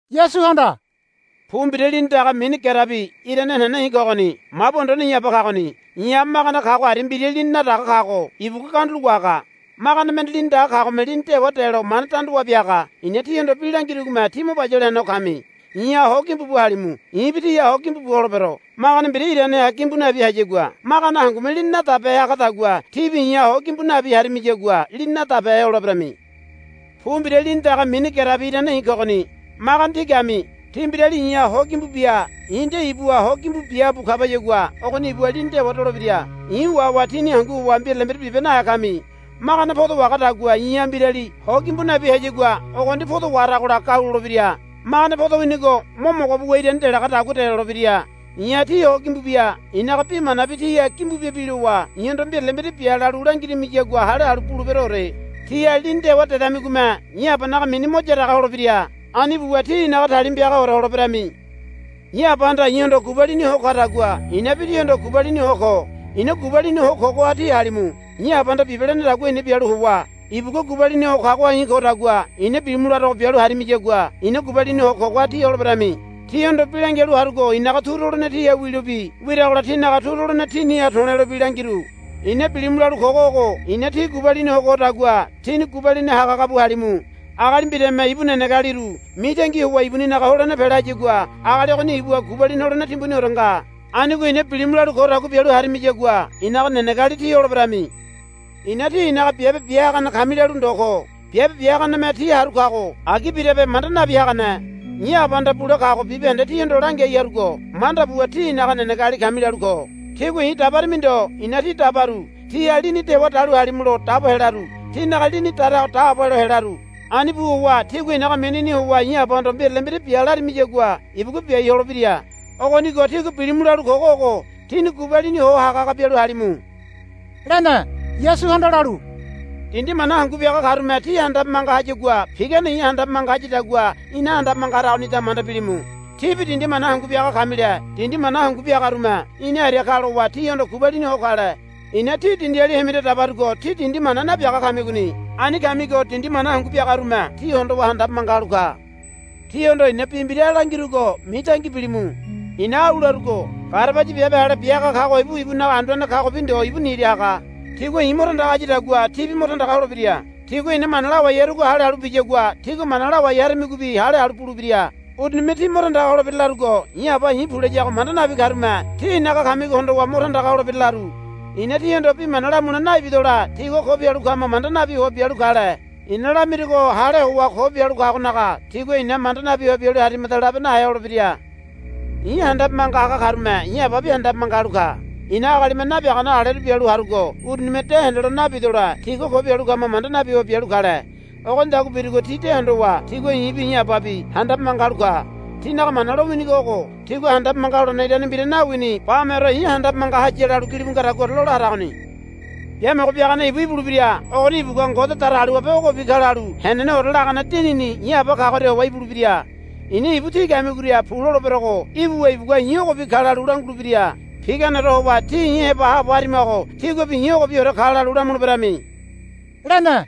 Yasuhanda, Pu mbira lini daga mini gerebi irane henene i̱ kogoni. Mabu anduane i̱ Aba kagoni. I̱ha magane kago aria mbira lini nadaga kago ibugua gandulo wahaga. Magane mende lini daga kagome lini dewa delo mane danda wabia haga. I̱na tíhondo bi langirugome tí mo bayale henego kami. I̱ha ho gimbu bu halimu. I̱bi tíha ho gimbu bu holebero. Magane mbira iraneha gimbu nabi hayagua magane hangume lini nadabehe hagadagua tíbi i̱ha ho gimbu nabi harimiyagua lini nadabehe holeberami. Pu mbira lini daga mini gerebi irane i̱ kogoni. Magane tí kami. Tí mbirali i̱ha ho gimbu bia i̱ nde ibuha ho gimbu bia bu kabayagua ogoni ibuha lini dewa dolebira. I̱ wahowa tíni hangu howa mbirale mbira bibe nahe kami. Magane podo wahagadagua i̱ha mbirali ho gimbu nabi hayagua ogoni podo waharagola gau lolebira. Magane podo winigo mo mogo buwa irani delagadagua delolebira. I̱ha tí ho gimbu bia i̱naga bi manabi tíha gimbu bia bilowa i̱hondo mbirale mbira bia lalu langirimiyagua hale halu buleberoore. Tíha lini dewa dedamigome i̱ Abanaga mini mo yaraga holebira. Ani buwa tí i̱naga talima piagaore holeberami. I̱ Abahanda i̱hondo gubalini ho kadagua i̱nabi tíhondo gubalini ho ko. I̱na gubalini ho kogoha tí halimu. I̱ Abahanda bibe lenedagua i̱na bialu howa ibugua gubalini ho kagoha i̱ kodagua i̱na bilimu larogo bialu harimiyagua i̱na gubalini ho kogoha tí holeberami. Tíhondo bi langialu harugo i̱naga turu holene tíha wilobi wiragola tínaga turu holene tíniha to̱lelobi langiru. I̱na bilimu lalu kogo ogo i̱na tí gubalini ho kodagua tíni gubalini hagahaga bu halimu. Agali mbirame ibu nenegealiru mitangi howa ibuninaga holene pela hayagua agali ogoni ibuha gubalini holene timbuniore nga. Anigo i̱na bilimu lalu kodagua bialu harimiyagua i̱naga nenegeali tí holeberami. I̱na tí i̱naga biabe bia hagane kami lalu ndo ko. Biabe bia haganeme ti haru haga kago agi birabe manda nabi hagane. I̱ Abahanda bule kago bibahende tíhondo langiai harugo manda buwa tí i̱naga nenegeali kami lalu ko. Tígua i̱ dabarimi ndo i̱na tí dabaru. Tíha lini dewa dalu halimulo dabo helaru. Tínaga lini darago daabo helo helaru. Ani bu howa tígua i̱naga minini howa i̱ Abahondo mbirale mbira bia larimiyagua ibugua biai holebira. Ogonigo tígua bilimu lalu kogo ogo tíni gubalini ho hagahaga bialu halimu, lene. Yasuhanda lalu, Dindi mana hangu biaga karume tí handabe manga hayagua pigane i̱ handabe manga hayadagua ina handabe manga haragonida manda bilimu. Tíbi dindi mana hangu biaga kamile dindi mana hangu biagarume ina aria ka lowa tíhondo gubalini ho kale. I̱na tí dindiali hemiria dabarugo tí dindi mana nabiaga kamigoni. Ani kamigo dindi mana hangu biagarume tí hondowa handabe manga halu ka. Tíhondo i̱na bi mbira langirugo mitangi bilimu. I̱na au larugo, Garabaya biabe ale bia haga kago ibu ibunaga anduane kagobi ndo ibu nira haga. Tigua i̱ mo tandaga hayadagua tíbi mo tandaga holebira. Tigua i̱na mana lawai harugo hale halu biyagua tígua mana lawai haramigobi hale halu bulebira. Urunime tí mo tandaga holebira larugo i̱ Aba i̱ pu layago manda nabi karume tí i̱naga kamigo hondowa mo tandaga holebira laru. I̱na tihondo bi mana lamule naibidole tigua ko bialu kama manda nabi howa bialu kale. I̱na lamirugo hale howa ko bialu kagonaga tigua ina manda nabi howa bialu harimada labe nahe holebira. I̱ handabe manga haga karume i̱ Ababi handabe manga halu ka. I̱na agalime nabiagane aleru bialu harugo urunime de hendelo nabidole tigua ko bialu kama manda nabi howa bialu kale. Ogonidagua birugo ti de hondowa tigua i̱bi i̱ Ababi handabe manga halu ka. Tinaga Mana lowinigo ogo, Tigua handabe manga holene irane mbira nawini bameore i̱ handabe manga haya, lalu gilibu ngadaguaore lola haragoni. Biamogo Biagane ibu ibulebira. Ogoni ibugua Ngode Datagaliwabe ogobi ka lalu heneneore lagane Dinini i̱ Aba kagoria howa ibulebira. I̱na ibu tí kamigoria pu loleberogo ibuwa ibugua i̱ ogobi ka lalu langulebira. Piganeore howa tí i̱ heba haabo harimago tíguabi i̱ ogobiore ka lalu lamuleberami, lene.